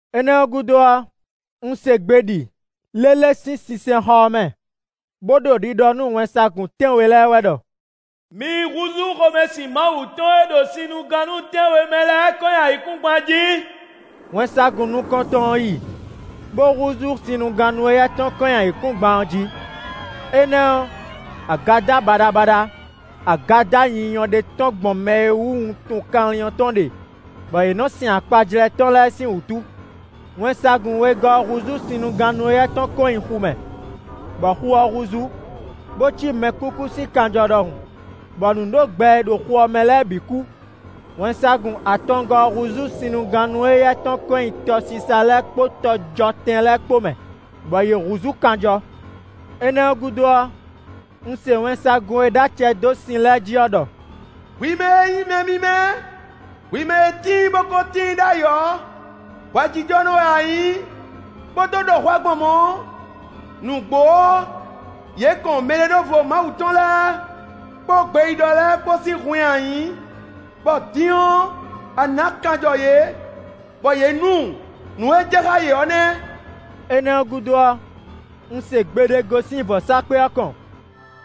Énɛ́ ɔ́ gúdo ɔ́, un se gbe ɖi lélé sín sinsɛnxɔ ɔ́ mɛ, bó ɖo ɖiɖɔ nú wɛnsagun tɛ́nwe lɛ́ɛ wɛ ɖɔ: “Mi yi húzú xomɛsin Mawu tɔn e ɖo sinnugannú tɛ́nwe mɛ lɛ́ɛ kɔn nyi ayǐkúngban jí!” Wɛnsagun nukɔntɔn ɔ́ yi, bó húzú sinnugannú éyɛ́ tɔn kɔn nyi ayǐkúngban jí. Énɛ́ ɔ́, agadá baɖabaɖa, agadá nyinyɔ ɖé tɔ́n gbɔn mɛ e wú wuntun kanlin ɔ́ tɔn ɖe, bɔ yě nɔ sɛn akpajlɛ́ tɔn lɛ́ɛ sín wútu. Wɛnsagun wegɔ́ ɔ́ húzú sinnugannú éyɛ́ tɔn kɔn nyi xu mɛ. Bɔ xu ɔ́ húzú, bó cí mɛkúkú sín kanjɔ ɖɔhun, bɔ nǔɖogbɛ e ɖo xu ɔ́ mɛ lɛ́ɛ bǐ kú. Wɛnsagun atɔngɔ́ ɔ́ húzú sinnugannú éyɛ́ tɔn kɔn nyi tɔsisa lɛ́ɛ kpó tɔjɔtɛn lɛ́ɛ kpó mɛ, bɔ yě húzú kanjɔ. Énɛ́ ɔ́ gúdo ɔ́, un se wɛnsagun e ɖó acɛ dó sin lɛ́ɛ jí ɔ́ ɖɔ: “Hwi mɛ e nyí mǐmɛ́, hwi mɛ e tíin bo ko tíin ɖ'ayǐ ɔ́, hwɛjijɔnɔ wɛ a nyǐ, bó dó ɖɔ hwɛ gbɔn mɔ̌. Nǔgbó ɔ́, yě kɔn mɛɖeɖóvo Mawu tɔn lɛ́ɛ kpó gbeyíɖɔ lɛ́ɛ kpó sín hun nyi ayǐ, bɔ din ɔ́, a nǎ kanjɔ yě, bɔ yě nu. Nǔ e jɛ xá yě ɔ́ nɛ́!” Énɛ́ ɔ́ gúdo ɔ́, un se gbe ɖé gosín vɔ̌sákpe ɔ́ kɔn,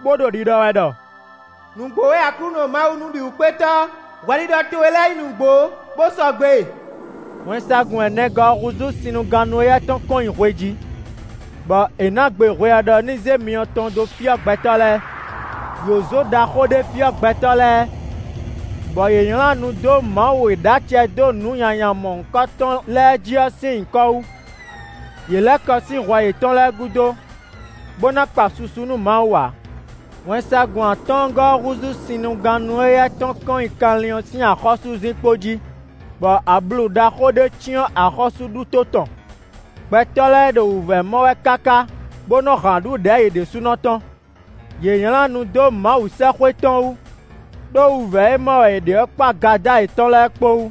bó ɖo ɖiɖɔ wɛ ɖɔ: “Nǔgbó wɛ Aklúnɔ Mawu Nǔbǐwúkpétɔ́, hwɛɖiɖɔ towe lɛ́ɛ nyí nǔgbó bó sɔgbe!” Wɛnsagun ɛnɛgɔ́ ɔ́ húzú sinnugannú éyɛ́ tɔn kɔn nyi hwe jí, bɔ è nǎ gbe hwe ɔ́ ɖɔ ní zé myɔ tɔn dó fyɔ́ gbɛtɔ́ lɛ́ɛ. Yǒzo ɖaxó ɖé fyɔ́ gbɛtɔ́ lɛ́ɛ, bɔ yě nylá nu dó Mawu e ɖó acɛ dó nǔ nyanya mɔ̌hunkɔtɔn lɛ́ɛ jí ɔ́ sín nyǐkɔ wú; yě lɛ́ kɔ sín hwɛ yětɔn lɛ́ɛ gúdo, bó ná kpa susu nú Mawu ǎ. Wɛnsagun atɔ́ɔ́ngɔ́ ɔ́ húzú sinnugannú éyɛ́ tɔn kɔn nyi kanlin ɔ́ sín axɔ́súzinkpo jí, bɔ ablu ɖaxó ɖé cyɔ́n axɔ́súɖuto tɔn. Gbɛtɔ́ lɛ́ɛ ɖo wǔvɛ́ mɔ wɛ káká bó nɔ́ han aɖǔ ɖɛ̌ yě ɖésúnɔ tɔn. Yě nylá nu dó Mawu sɛ́xwé tɔn wú, ɖó wǔvɛ́ e mɔ wɛ yě ɖe ɔ́ kpó agadá yětɔn lɛ́ɛ kpó wú.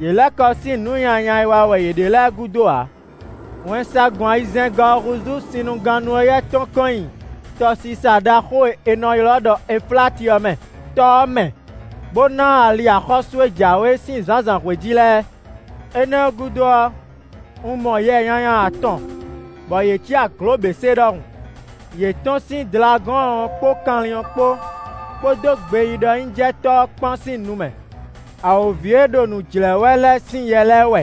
Yě lɛ́ kɔ sín nǔ nyanya e wa wɛ yě ɖe lɛ́ɛ gúdo ǎ. Wɛnsagun ayizɛ́ngɔ́ ɔ́ húzú sinnugannú éyɛ́ tɔn kɔn nyi tɔsisa ɖaxó e è nɔ ylɔ́ ɖɔ Efláti ɔ́ mɛ. Tɔ ɔ́ mɛ, bó ná ali axɔ́sú e jǎwe sín zǎnzǎnhwe jí lɛ́ɛ. Énɛ́ ɔ́ gúdo ɔ́, un mɔ yɛ nyanya atɔn bɔ yě cí aglǒběsé ɖɔhun; yě tɔ́n sín Dlagɔ́ɔn ɔ́ kpó kanlin ɔ́ kpó, kpódó gbeyíɖɔnyíjɛtɔ́ ɔ́ kpán sín nu mɛ. Awǒvi e ɖo nǔ jlɛ̌ wɛ lɛ́ɛ sín yɛ lɛ́ɛ wɛ.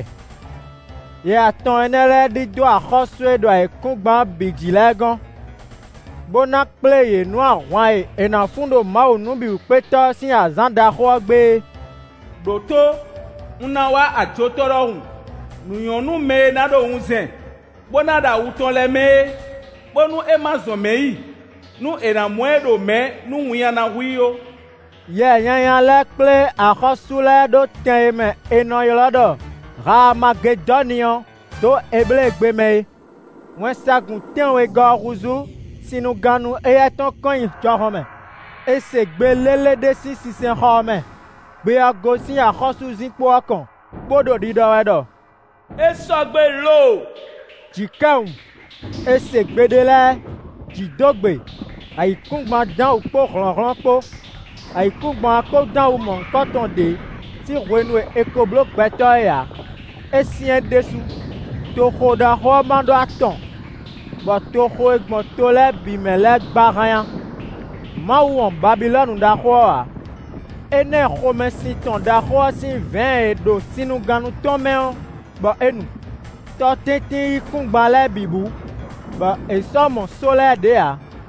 Yɛ atɔn énɛ́ lɛ́ɛ ɖidó axɔ́sú e ɖo ayǐkúngban ɔ́ bǐ jí lɛ́ɛ gɔ́n, bó ná kplé yě nú ahwan e è ná fun ɖo Mawu Nǔbǐwúkpétɔ́ ɔ́ sín azǎn ɖaxó ɔ́ gbe é. “Đǒtó, un ná wá ajotɔ́ ɖɔhun! Nǔ nyɔ́ nú mɛ e ná ɖo wunzɛn, bó ná ɖo awu tɔn lɛ́ɛ mɛ é, bónú é ma zɔn mɛ̌ yi, nú è nǎ mɔ ɛ ɖo mɛ̌ nú winnyá ná hu i ó.” Yɛ nyanya lɛ́ɛ kplé axɔ́sú lɛ́ɛ ɖó tɛn e mɛ è nɔ ylɔ́ ɖɔ Haamagedɔ́ni ɔ́ dó Ebléegbe mɛ é. Wɛnsagun tɛ́nwegɔ́ ɔ́ húzú sinnugannú éyɛ́ tɔn kɔn nyi jɔhɔn mɛ. È se gbe lélé ɖé sín sinsɛnxɔ ɔ́ mɛ; gbe ɔ́ gosín axɔ́súzinkpo ɔ́ kɔn, bó ɖo ɖiɖɔ wɛ ɖɔ: “É sɔgbe lo!” Jǐkɛwun; è se gbe ɖé lɛ́ɛ; jǐ dó gbe; ayǐkúngban dán wǔ kpó hlɔ̌nhlɔ́n kpó. Ayǐkúngban ɔ́ ko dán wǔ mɔ̌hunkɔtɔn ɖě sín hwenu e è ko bló gbɛtɔ́ é ǎ; é syɛ́n ɖésú! Toxo ɖaxó ɔ́ má ɖó atɔn, bɔ toxo e gbɔn to lɛ́ɛ bǐ mɛ lɛ́ɛ gba hánnyá. Mawu wɔn Babilɔ́nu ɖaxó ɔ́ ǎ; é ná ɛ xomɛsin tɔn ɖaxó ɔ́ sín vɛ̌ɛn e ɖo sinnugannú tɔn mɛ ɔ́, bɔ é nu. Tɔtɛ́ntin yíkúngban lɛ́ɛ bǐ bú, bɔ è sɔ́ mɔ só lɛ́ɛ ɖě ǎ.